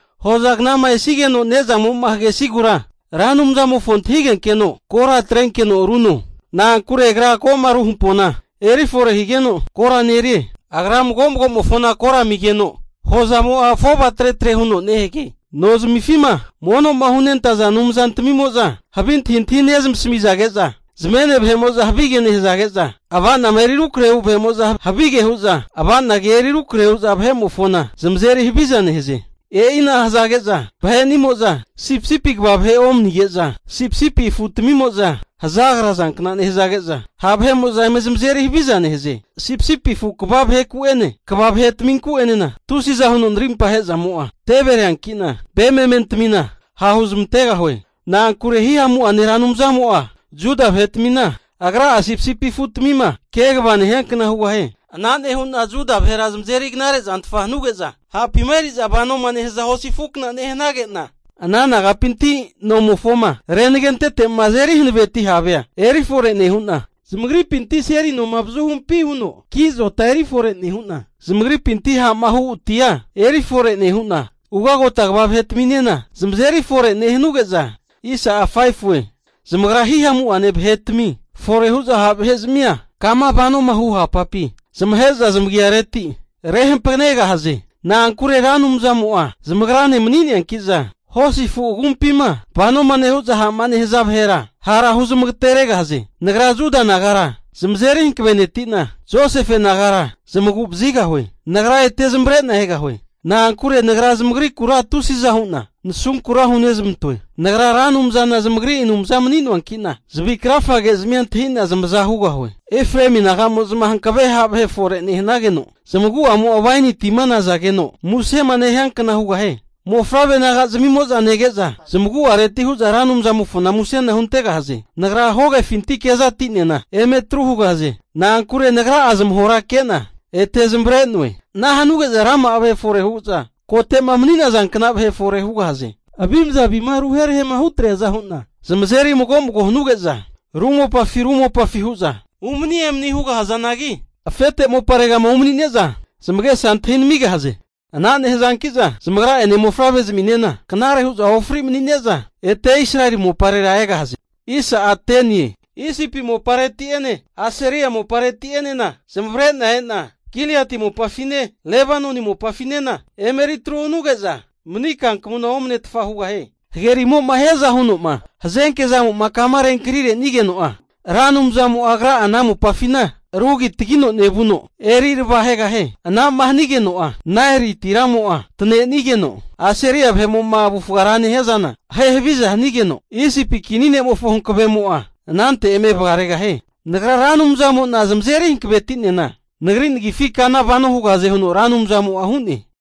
Hozagnama esigeno ne'zamo'ma hagesigura Ra Anumzamofo antahigenkeno kora atrenkeno runo. Na'ankure agra ko'ma ru hampona eri fore nehigeno kora nerie. Agra mago'magomofona kora amigeno hozazmimo'a afova tretre huno nehage. Nozmifima mono'ma hunentaza anumzantmimo'za havi antahintahi nezamasamizage'za, zamene vahe'mo'za havige nehazage'za, ava'nama eri rukrahe'ma hu vahe'mo'za havige hu'za ava'na kea eri rukrahe hu'za vahe'mofona zamazeri haviza nehaze. E'ina hazage'za vahe'nimo'za sipisipi kva vahe omanige'za sipisipi afutamimo'za hazagrazankna nehazage'za, ha' vahe'mo'za eme zamazeri haviza nehaze. Sipisipi afu kva vaheku'ene kva vahetaminku'enena tusiza huno narimpa ahe'zamo'a tevereankina, ve mementamina ha' huzmantegahue. Na'ankure Hihamu'ane Ra Anumzamo'a Juda vahetmina, agra'a sipisipi afutmima kegava nehiankna hugahie. Ana nehu'na Juda vahera zamazeri knare zantfa hanuge'za, hapima eri'za vanoma nehaza hosi afukna nehanage'na, ana nagapinti nomofoma renagentete'ma azeri hanaveti havea eri fore nehu'na, zamagripinti seli noma avazuhumpi huno ki azota eri fore nehu'na, zamagripinti ha'ma hu atia eri fore nehu'na, ugagota kva vahetaminena zamazeri fore nehanuge'za, zamagra hihamu'ane ha' vahetami fore hu'za ha' vahe'zmia kama vanoma nehaza hu hapapi zamahe'za zamagareti rehampakanegahaze. Na'ankure Ra Anumzamo'a zamagrane mani'neankiza, hosi afu agumpima vanoma nehu'za ha'ma nehaza vahera hara huzmagateregahaze. Nagra Juda nagara zamazeri hankaveneti'na, Josefe nagara zamagu'vazigahue. Nagra ete zamavare'na egahue. Na'ankure Nagra zamagrikura tusiza hu'na nasunkura hunezmantoe. Nagra Ra Anumzana zamagri Anumza mani'noanki'na zavi krafagezmia antahi'na zamaza hugahue. Efraemi naga'mo'za hankave ha' vahe fore nehanageno, zamagu'amo'a waini tima nazageno musema nehiankna hugahie. Mofavre naga'zamimo'za nege'za zamagu'areti hu'za Ra Anumzamofona musena huntegahaze. Nagra hogefinti kezati'nena eme atru hugahaze. Na'ankure Nagra'a zamahora ke'na ete zamavare'noe. Ana hanogu ge'za rama'a vahe fore hu'za kote'ma mani'nazankna vahe fore hugahaze. Avimza avima ru herahe'ma hutreaza hu'na zamazeri mago mago huge'za ru mopafi ru mopafi hu'za umani emani hugahazanagi, afete moparegama umanine'za zamagesa antahi namigahaze. Ana nehazanki'za zamagra'ene mofavrezminena knare hu'za ofri mani'neza, ete Israeli moparera egahaze. Isipi mopareti'ene Asiria mopareti'enena zamavare'na e'na Giliati mopafine, Lebanoni mopafinena emeri atru hanuge'za mani kankamuna omanetfa hugahie. Hagerimo'ma hiaza huno'ma hazenke zamo'ma kama renkani renigeno'a, Ra Anumzamo'a agra'a ana mopafina rugitagino nevuno, eri arava ahegahie. Ana'ma hanigeno'a Naeli tiramo'a tanenigeno, Asiria vahe'mo'ma avufga rama nehia zana ahe haviza hanigeno, Isipi kinimofo hankavemo'a anante eme vagaregahie. Nagra Ra Anumzamo'na zamazeri hankaveti'nena Nagri nagifi kana vano hugahaze huno Ra Anumzamo'a hu'ne.